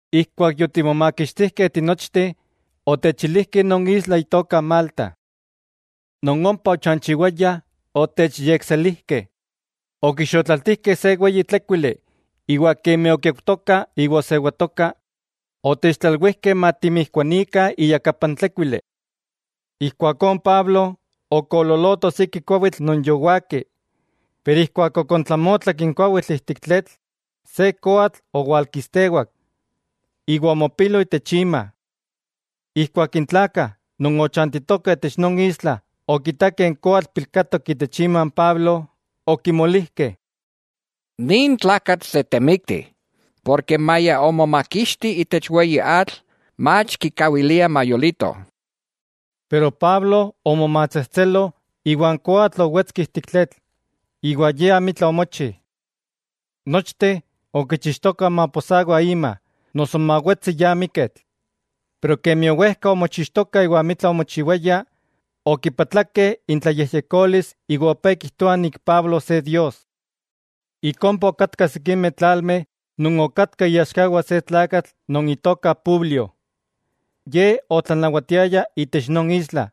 Ijkuak yotimomakixtijkeh tinochteh, otechilijkeh non isla itoka Malta. Non ompa ochanchiwayah otechyekselijkeh; okixotlaltijkeh se weyi tlékuili, iwa kemi okiaujtoka iwa osewatoka, otechtlalwijkeh matimijkuanikah iyakapa n tlékuili. Ijkuakó Pablo okoololoto siki kuawitl non yowaki. Pero ijkuak okontlamotlak n kuawitl ijtik tletl, se koatl owalkistewak, iwa omopilo itech ima. Ijkuak n tlakah non ochantitokah itech non isla okitakeh n koatl pilkatok itech ima n Pablo, okimolijkeh: —Nin tlakatl se temikti, porke maya omomakixti itech weyi atl, mach kikawiliah mayolito. Pero Pablo omomatsejtselo iwa n koatl owetski ijtik tletl, iwa ye amitla omochi. Nochteh okichixtokah maposawa ima, noso mawetsi ya miketl. Pero kemi owejka omochixtokah iwa amitla omochiwaya, okipatlakeh intlayejyekolis iwa opé kijtoah Pablo se dios. Ik ompa okatkah sikimeh tlalmeh non okatkah iaxkawah se tlakatl non itoka Publio. Ye otlanawatiaya itech non isla,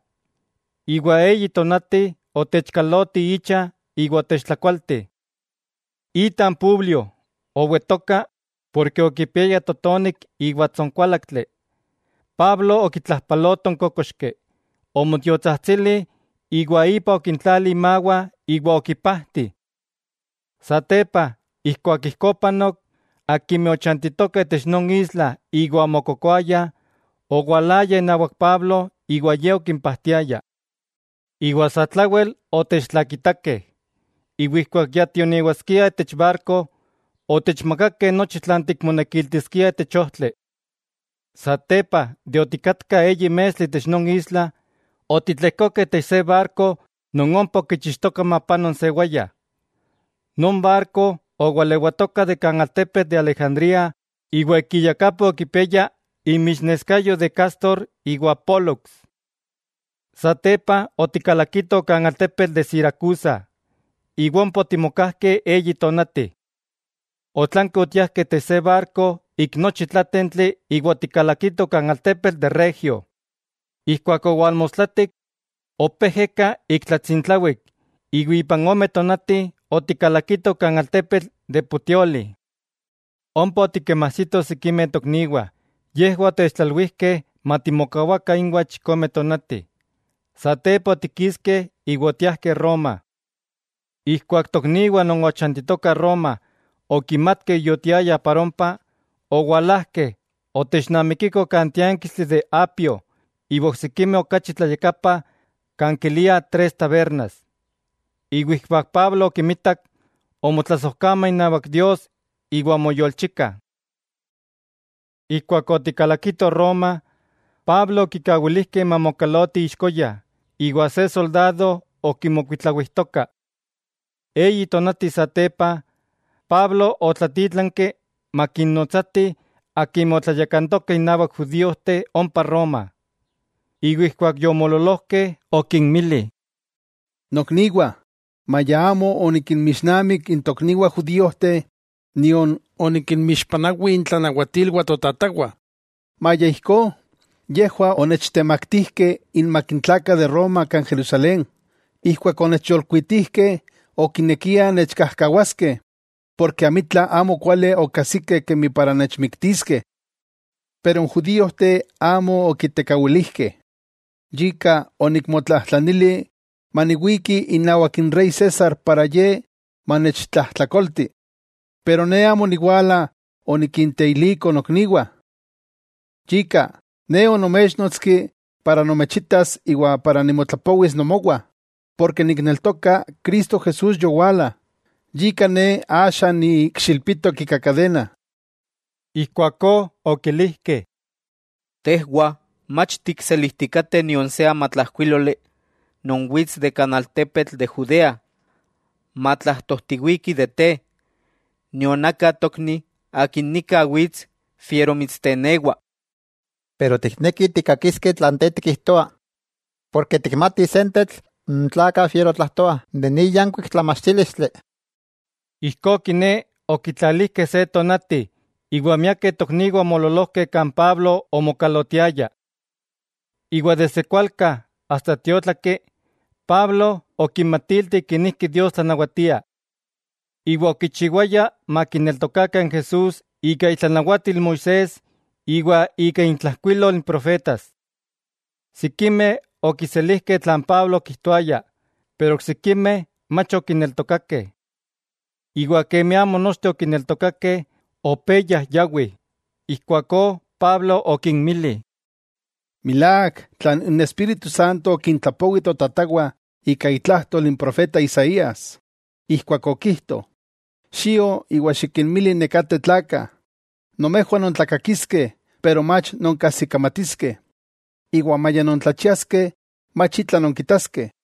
iwa eyi tonati otechkaloti icha iwa otechtlakualti. Ita n Publio owetoka porke okipiaya totonik iwa tsonkuálaktli. Pablo okitlajpaloto n kókoxki, omotiotsajtsili iwa ipa okintlali imawah iwa okipajti. Satepa ijkuak ijkó opanok, akimeh ochantitokah itech non isla iwa omokokoayah, owalayah inawak Pablo iwa ye okimpajtiaya. Iwa satlawel otechtlakitakeh, iwa ijkuak ya tionewaskiah itech barko, otechmakakeh nochi tlan tikmonekiltiskiah itech ojtli. Satepa de otikatkah eyi mestli itech non isla, otitlejkokeh itech se barko non ompa okichixki mapano n sewaya. Non barko owalewatoka de kan altepetl de Alejandría iwa ik iyakapa okipiaya inmixneskayo de Cástor iwa Pólux. Satepa otikalakitoh kan altepetl de Siracusa, iwa ompa otimokajkeh eyi tonati, otlanki otiajkeh itech se barko ik nochi tlátentli iwa otikalakitoh kan altepetl de Regio. Ijkuak owalmostlatik, opé ejeka ik tlatsintlawik, iwa ipan ome tonati otikalakitoh kan altepetl de Puteoli. Ompa otikinmajsitoh sikimeh tokniwah, yejwah otechtlalwijkeh matimokawakah inwah chikome tonati, satepa otikiskeh iwa otiajkeh Roma. Ijkuak tokniwah non ochantitokah Roma okimatkeh yotiayah para ompa, owalajkeh otechnamikikoh kan tiánkistli de Apio iwa oksikimeh okachi tlayakapa kan kiliah Tres Tabernas. Iwa ijkuak Pablo okimitak, omotlasojkama inawak Dios iwa omoyolchika. Ijkuak otikalakitoh Roma, Pablo okikawilijkeh mamokalotiti ixkoya iwa se soldado okimokuitlawijtoka. Eyi tonati satepa, Pablo otlatítlanki makinnotsatih akimeh otlayakantokah innawak judíojteh ompa Roma. Iwa ijkuak yomoololojkeh okinmili: —Nokniwah, maya amo onikinmixnamik n tokniwah judíojteh, nion onikinmixpanawi intlanawatilwah totatawah, maya ijkó, yejwah onechtemaktijkeh inmak n tlakah de Roma kan Jerusalén. Ijkuak onechyolkuitijkeh okinekiah nechkajkawaskeh, porke amitla amokuali okajsikeh kemi para nechmiktiskeh. Pero n judíojteh amo okitekawilijkeh, yika onikmotlajtlanili maniwiki inawak n rey César para ye manechtlajtlakolti, pero ne amo oniwala onikinteiliko nokniwah. Yika, ne onoméchnotski para nomechitas iwa para nimotlapowis nomowah; porke nikneltoka Cristo Jesús yowala, yika ne axa niikxilpitok ika kadena. Ijkuakó okilijkeh: —Tejwah mach tikselijtikateh nion se amatlajkuíloli non wits de kan altepetl de Judea matlajtojtiwiki de te, nion aka tokni akin nika wits fiero mitstenewa. Pero tiknekih tikkakiskeh tlan te tikijtoa, porke tikmatih sentetl n tlakah fiero tlajtoah de nin yankuik tlamachtílistli. Ijkó kiné, okitlalijkeh se tonati, iwa miakeh tokniwah omoololojkeh kan Pablo omokalotiaya. Iwa desde kualka asta tiótlaki, Pablo okinmatilti kenijki Dios tlanawatia. Iwa okichiwaya makineltokakah n Jesús ika itlanawatil Moisés iwa ika intlajkuilol n profetas. Sikimeh okiselijkeh tlan Pablo okijtoaya, pero oksikimeh mach okineltokakeh. Iwa kemi amo nochteh okineltokakeh, opé yajyawih. Ijkuakó Pablo okinmili: —Milák tlan n Espíritu Santo okintlapowi totatawah ika itlajtol n profeta Isaías, ijkuak okijto: Xio iwa xikinmili nekateh tlakah: Nomejwah nontlakakiskeh pero mach nonkajsikamatiskeh, iwa maya nontlachiaskeh mach itla nonkitaskeh.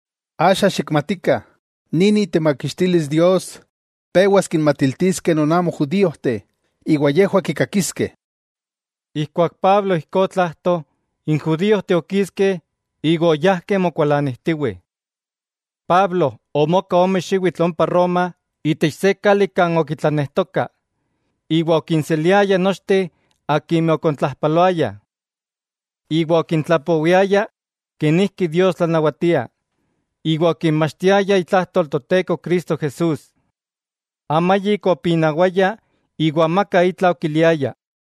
Axa xikmatikah, nin itemakixtilis Dios pewas kinmatiltiskeh non amo judíojteh, iwa yejwah kikakiskeh. Ijkuak Pablo ijkó otlajto, n judíojteh okiskeh iwa oyajkeh mokualanijtiwih. Pablo omoka ome xiwitl ompa Roma itech se kali kan okitlanejtoka, iwa okinseliaya nochteh akimeh okontlajpaloayah. Iwa okintlapowiaya kenijki Dios tlanawatia, iwa okinmachtiaya itlajtol Toteko Cristo Jesús. Amayik opinawaya iwa amaka itla okiliaya.